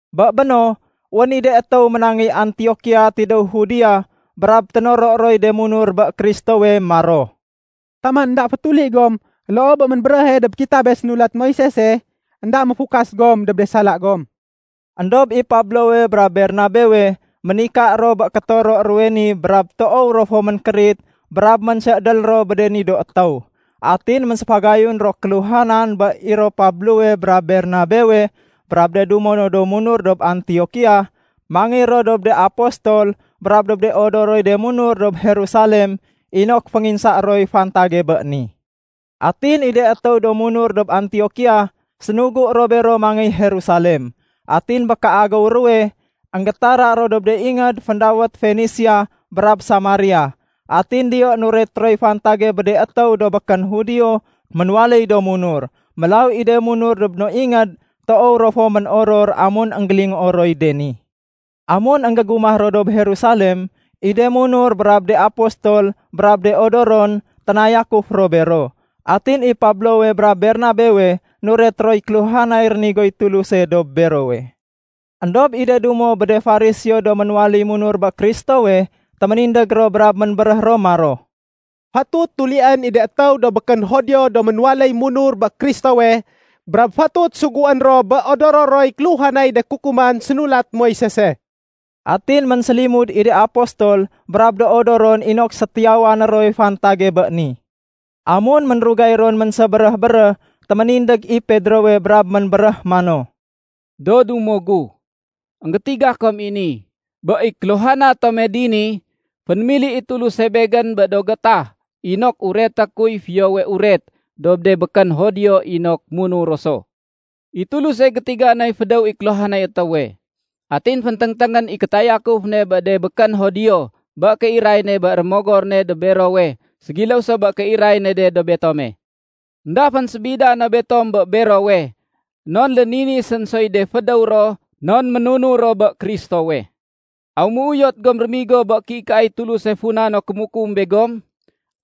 Bé béno, wén i de étéw ménangéy Antiokia tidéw Judea brab ténoro roy de munur bé Kristowe maro, “Taman énda fétuli gom loo bé ménbéréhe dob kitabe sénulat Moisese, énda méfukas gom dob de sala gom.” Endob i Pablowe brab Bernabewe ménika ro bé kétoro ruwe ni brab toow ro fo ménkérit brab ménsédél ro bé de ni do étéw. Atin ménséfagayun ro kéluhanan bé i ro Pablowe brab Bernabewe brab de dumo do munur dob Antiokia, mangéy ro dob de apostol brab dob de odoroy de munur dob Jerusalem inok fénginsaé roy fantage bé ni. Atin i de étéw do munur dob Antiokia sénugu ro bero mangéy Jerusalem. Atin bé kéagéw ruwe, énggétara ro dob de ingéd féndawét Fenisia brab Samaria. Atin diyo nuret roy fantage bé de étéw do békén Judio ménwaléy do munur. Mélaw i de munur dob do no ingéd toow ro fo ménoror amun énggélingoo roy de ni. Amun énggégumah ro dob Jerusalem, i de munur brab de apostol brab do odoron, ténayakuf ro bero. Atin i Pablowe brab Bernabewe nuret roy kéluhanay rénigoy Tuluse dob berowe. Endob i de dumo bé de Fariseo do ménwaléy munur bé Kristowe, téménindég ro brab ménbéréh ro maro, “Fatut tulién i de étéw do békén Judio do ménwaléy munur bé Kristowe brab fatut suguén ro bé odoro roy kéluhanay de kukuman sénulat Moisese.” Atin ménsélimud i de apostol brab do odoron inok sétiyawané roy fantage bé ni. Amun ménrugay ron ménsébéréh-béréh, téménindég i Pedrowe brab ménbéréh mano, “Do dumo gu, énggétiga kom i ni: Bé i kéluhana tome dini, fénémili i Tuluse begén bé do gétah inok ureté kuy Fiyowe Uret dob de békén Judio inok munur ro so. I Tuluse gétiga noy fédéw i kéluhanay étéwe. Atin fénténgténgén i kétayakuf ne bé de békén Judio bé kéiray ne bé Rémogor ne dob berowe ségiléw so bé kéiray ne de dob betome. Enda fénsébida no betom bé berowe non léninisén soy de fédéw ro non ménunur ro bé Kristowe. Aw méuyot gom rémigo bé kéikaay Tuluse funa no kémukum begom?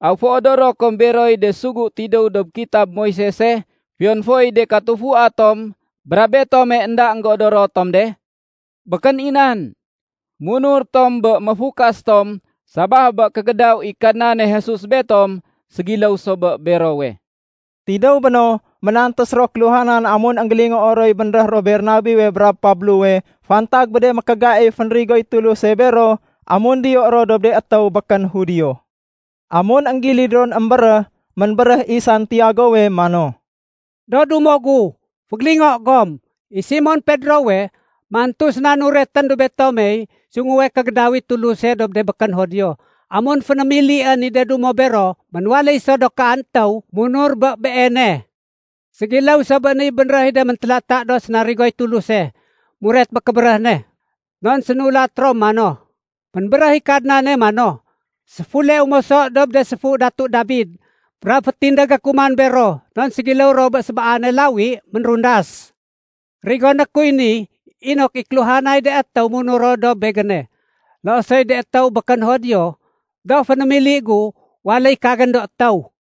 Aw féodoro kom beroy de sugu tidéw dob kitab Moisese fiyon foy de katufua tom brab betome énda énggéodoro tom de? Békén i nan! Munur tom bé méfukas tom sabaf bé kégédaw i Kadnane Jesus, betom ségiléw so bé berowe.” Tidéw béno, ménantés ro kéluhanan amun énggélingoo roy bénréh ro Bernabewe brab Pablowe fantag bé de mékégaif fénrigoy Tuluse bero amun diyo ro dob de étéw békén Judio. Amun énggilid ron émbéréh, ménbéréh i Santiagowe mano, “Do dumo gu, fégélingo gom! I Simon Pedrowe, mantu séna nuretén dob betomey sunguwe kégédaw i Tuluse dob de békén Judio amun fénémilién i de dumo bero ménwaléy so do kaan étéw munur bé Beene. Ségiléw so bé niy bénréh i de méntélata do sénarigoy Tuluse muret bé kébéréh ne. Non sénulat ro mano, ‘Ménbéréh i Kadnane mano, séfuleu moso dob de séfu Datu Dabid. Brab fétindégé ku man bero non ségiléw ro bé sébaane lawi ménrundas. Rigoné kuy ni inok i kéluhanay de étéw munur ro dob Begéne, loo soy de étéw békén Judio do fénémili gu waléy kagén do étéw.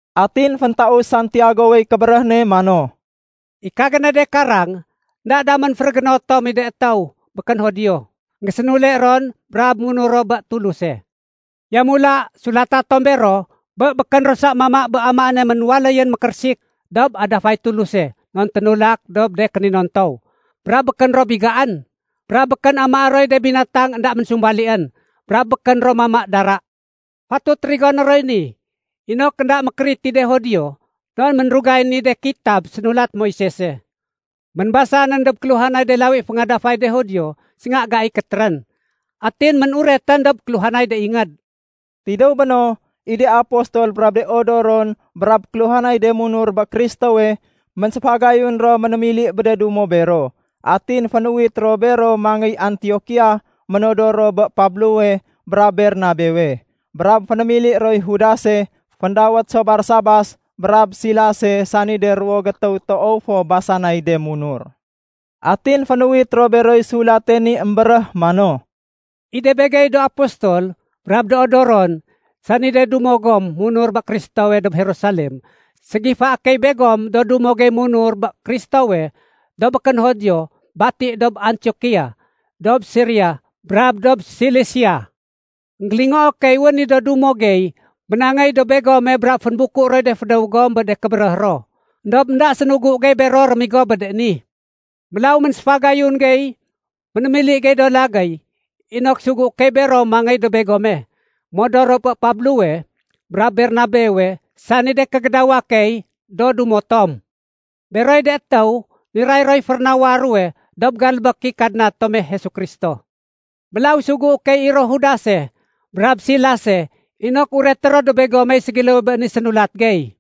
Atin féntaus Santiagowey kébéréh ne mano, “I kagéne de karang, énda damén férégéno tom i de étéw békén Judio énggésénule ron brab munur ro bé Tuluse. Yamula, sulata tom bero, bé békén ro sa mama bé amaéne ménwaléyén mékérésik dob adafay Tuluse non ténulak dob de kéninontow, brab békén ro bigaén, brab békén amaé roy de binatang énda ménsumbalién, brab békén ro mama dara. Fatut rigoné roy ni inok énda mékérit i de Judio non ménrugayén i de kitab sénulat Moisese, ménbasanén dob kéluhanay de lawi féngadafay de Judio sénga gai kétérén, atin ménuretén dob kéluhanay de ingéd.” Tidéw béno, i de apostol brab de odoron brab kéluhanay de munur bé Kristowe, ménséfagayun ro ménémili bé de dumo bero. Atin fénuwit ro bero mangéy Antiokia ménodor ro bé Pablowe brab Bernabewe. Brab fénémili roy Judase (féndawét so Barsabas) brab Silase sani de ruwo gétéw toow fo basanay de munur. Atin fénuwit ro beroy sulate ni émbéréh mano, “I de begey do apostol brab do odoron, sani de dumo gom munur bé Kristowe dob Jerusalem, ségifaé key begom do dumo gey munur bé Kristowe do békén Judio bati dob Antiokia, dob Siria, brab dob Silisia. Enggélingoo key wén i do dumo gey ménangéy dob begome brab fénbuku roy de fédéw gom bé de kébéréh ro. Endob énda sénugu gey bero rémigo bé de ni. Mélaw ménséfagayun gey ménémili do lagéy inok sugué key bero mangéy dob begome. Modor ro bé Pablowe brab Bernabewe sani de kégédawa key do dumo tom. Beroy de étéw niray roy férénawa ruwe dob galbék i Kadna tome Jesu Kristo. Mélaw sugué key i ro Judase brab Silase inok ureté ro dob begomey ségiléwe bé ni sénulat gey.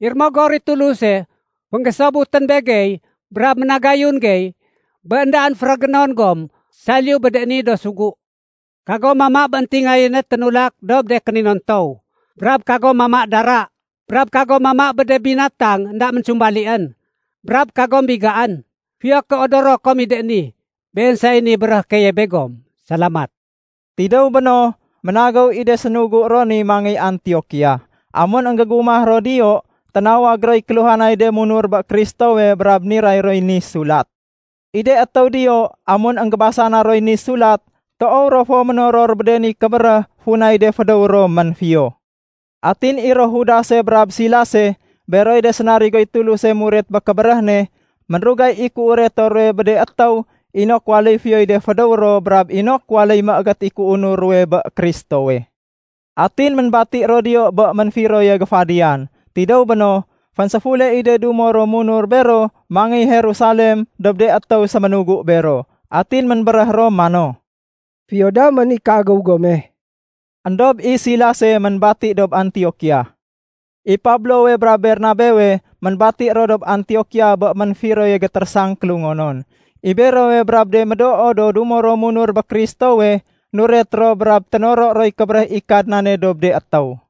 I Rémogor i Tuluse fénggésobutén begey brab ménagayun gey bé éndaén férégénon gom saliyu bé de ni do sugu: Kagom mama bé éntingayéne ténulak dob de kéninontow, brab kagom mama dara, brab kagom mama bé de binatang énda ménsumbalién, brab kagom bigaén. Fiyo ké odoro kom i de ni. Been say niy béréhé keye begom. Salamat.” Tidéw béno, ménagéw i de sénugu ro ni mangéy Antiokia. Amun énggégumah ro diyo, ténawag roy kéluhanay de munur bé Kristowe brab niray roy ni sulat. I de étéw diyo amun énggébasana roy ni sulat, toow ro fo ménoror bé de ni kébéréh funay de fédéw ro ménfiyo. Atin i ro Judase brab Silase (beroy de sénarigoy Tuluse muret bé kébéréh ne), ménrugay i kéureto ruwe bé de étéw inok waléy fiyoy de fédéw ro brab inok waléy méégét i kéunur ruwe bé Kristowe. Atin ménbati ro diyo bé ménfiroye géfadiyan. Tidéw béno, fénséfule i de dumo ro munur bero mangéy Jerusalem dob de étéw séménugu bero. Atin ménbéréh ro mano, “Fiyo damén i kéagéw gome.” Endob i Silase ménbati dob Antiokia. I Pablowe brab Bernabewe ménbati ro dob Antiokia bé ménfiroye gétérésang kélungonon. I berowe brab de médoo do dumo ro munur bé Kristowe, nuret ro brab ténoro roy kébéréh i Kadnane dob de étéw.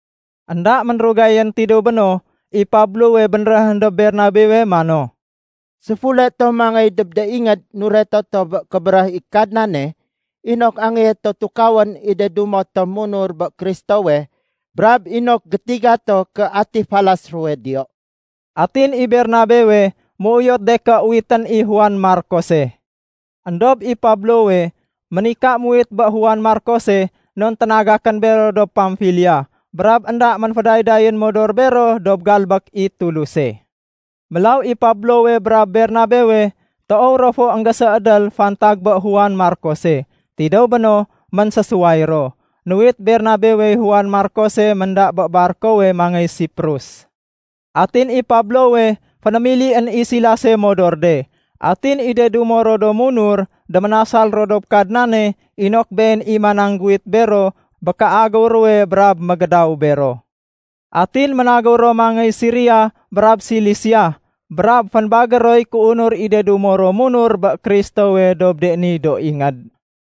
Enda ménrugayén tidéw béno, i Pablowe bénréhén dob Bernabewe mano, “Séfule to mangéy dob de ingéd nureto to bé kébéréh i Kadnane inok angéyé to tukawén i de dumo tom munur bé Kristowe brab inok gétiga to ké ati falas ruwe diyo.” Atin i Bernabewe méuyot de ké uwitén i Juane Markose. Endob i Pablowe ménika muwit bé Juan Markose non ténagakén bero dob Pamfilia brab énda ménfédaydayén modor bero dob galbék i Tuluse. Mélaw i Pablowe brab Bernabewe toow ro fo énggésédél fantag bé Juan Markose. Tidéw béno ménsésuway ro. Nuwit Bernabewey Juan Markose ménda bé barkowe mangéy Siprus. Atin i Pablowe fénémilién i Silase modor de. Atin i de dumo ro do munur déménasal ro dob Kadnane inok Been i manangguwit bero bé kéagéw ruwe brab mégédaw bero. Atin ménagéw ro mangéy Siria brab Silisia, brab fénbagér roy kéunur i de dumo ro munur bé Kristowe dob de ni do ingéd.